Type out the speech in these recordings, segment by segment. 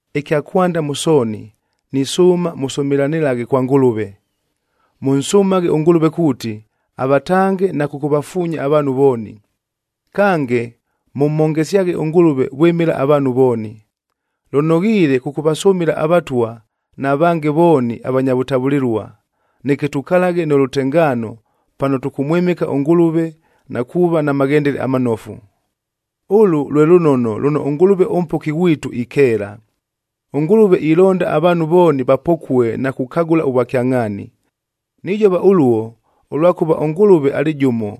Ɨkya kwanda mʉ sooni, nisʉʉma mʉsʉmɨlanɨlaghe kwa Ngʉlʉve. Mʉnsʉmaghe ʉNgʉlʉve kuuti, avatange na kʉkʉvafuunya avaanhu vooni. Kange, mʉmhongesyaghe ʉNgʉlʉve vwɨmɨla avaanhu vooni. Lʉnoghiile kʉkʉvasʉmɨla avatwa na vange vooni avanya vʉtavʉlɨlua, neke tukalaghe nʉ lʉtengaano, pano tʉkʉmwɨmɨka ʉNgʉlʉve na kuuva na maghendele amanofu. Ʉlʉ lwe lʉnono lʉno ʉNgʉlʉve ʉMpoki ghwitu ikeela. ɄNgʉlʉve ilonda avaanhu vooni vapokue na kukagʉla ʉvwakyangʼhaani. Nijova ʉluo, ʉlwakʉva ʉNgʉlʉve alɨ jʉmo,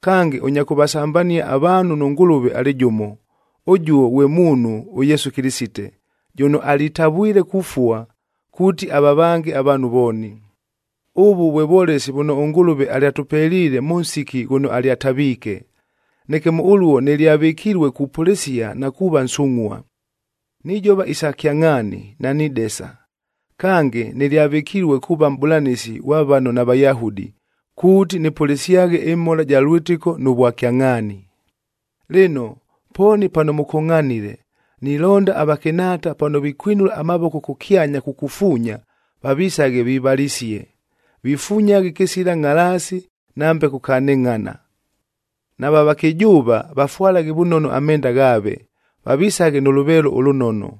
kange ʉnya kʉvasambania avaanhu nʉ Ngʉlʉve alɨ jʉmo, ʉjuo ghwe muunhu ʉYesu Kɨlɨsite, jʉno alitavwile kufua kuuti avavange avaanhu vooni. Ʉvʉ vwe vwolesi vʉno ʉNgʉlʉve alyatʉpeliile mʉ nsiki ghʉno alyataviike. Neke mʉ ʉluo, nɨlyavɨkilue kupʉlɨsia na kuuva nsungʼhua. Nijova isa kyangʼhaani, nanidesa. Kange, nɨlyavɨkilue kuuva mʼbʉlanɨsi ghwa vano naVayahudi, kuuti nɨpʉlɨsyaghe ɨmhola ja lwɨtɨko nʉ vwakyangʼhaani. Lɨno, pooni pano mʉkongʼhanile, nilonda avakɨnhaata pano vikwinula amavoko kʉkyanya kukufuunya, vavisaghe vivalisie, vifunyaghe kɨsila ngʼhalaasi nambe kukanɨngʼhana. Nava vakɨjʉʉva vafwalaghe vʉnono amenda ghaave, vavisaghe nʉ lʉveelo ʉlʉnono,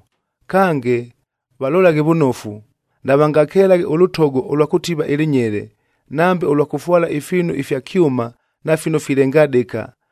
kange valolaghe vʉnofu, navangakelaghe ʉlʉtogo ʉlwa kʉtiva ɨlɨnyele, nambe ʉlwa kʉfwala ifiinu ifya kyʉma na fino filengadɨka,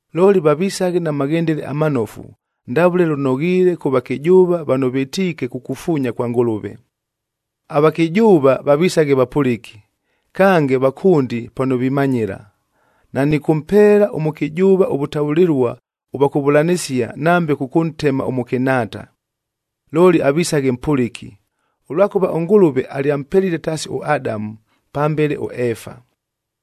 Looli vavisaghe na maghendele amanofu, ndavʉle lʉnoghiile kʉ vakɨjʉʉva vano vɨtiike kukufuunya kwa Ngʉlʉve. Avakɨjʉʉva vavisaghe vapʉlɨki, kange vakʉndi pano vimanyɨla. Nanɨkʉmpeela ʉmʉkɨjʉʉva ʉvʉtavʉlɨlua ʉvwa kʉvʉlanɨsia nambe kʉkʉntema ʉmʉkɨnhaata. Looli avisaghe mpʉlɨki, ʉlwakʉva ʉNgʉlʉve alyampelile taasi ʉAdamu, pambele ʉEefa.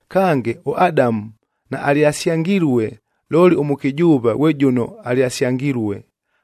Kange, ʉAdamu naalyasyangilue, looli ʉmʉkɨjʉʉva ghwe jʉno alyasyangilue,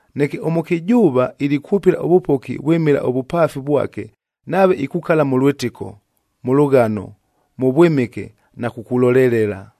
Neke ʉmʉkɨjʉʉva ilikwʉpɨla ʉvʉpoki vwɨmɨla ʉvʉpaafic vwake nave ikukala mʉ lwɨtɨko, mʉ lʉghano, mʉ vwɨmɨke na kukulolelela.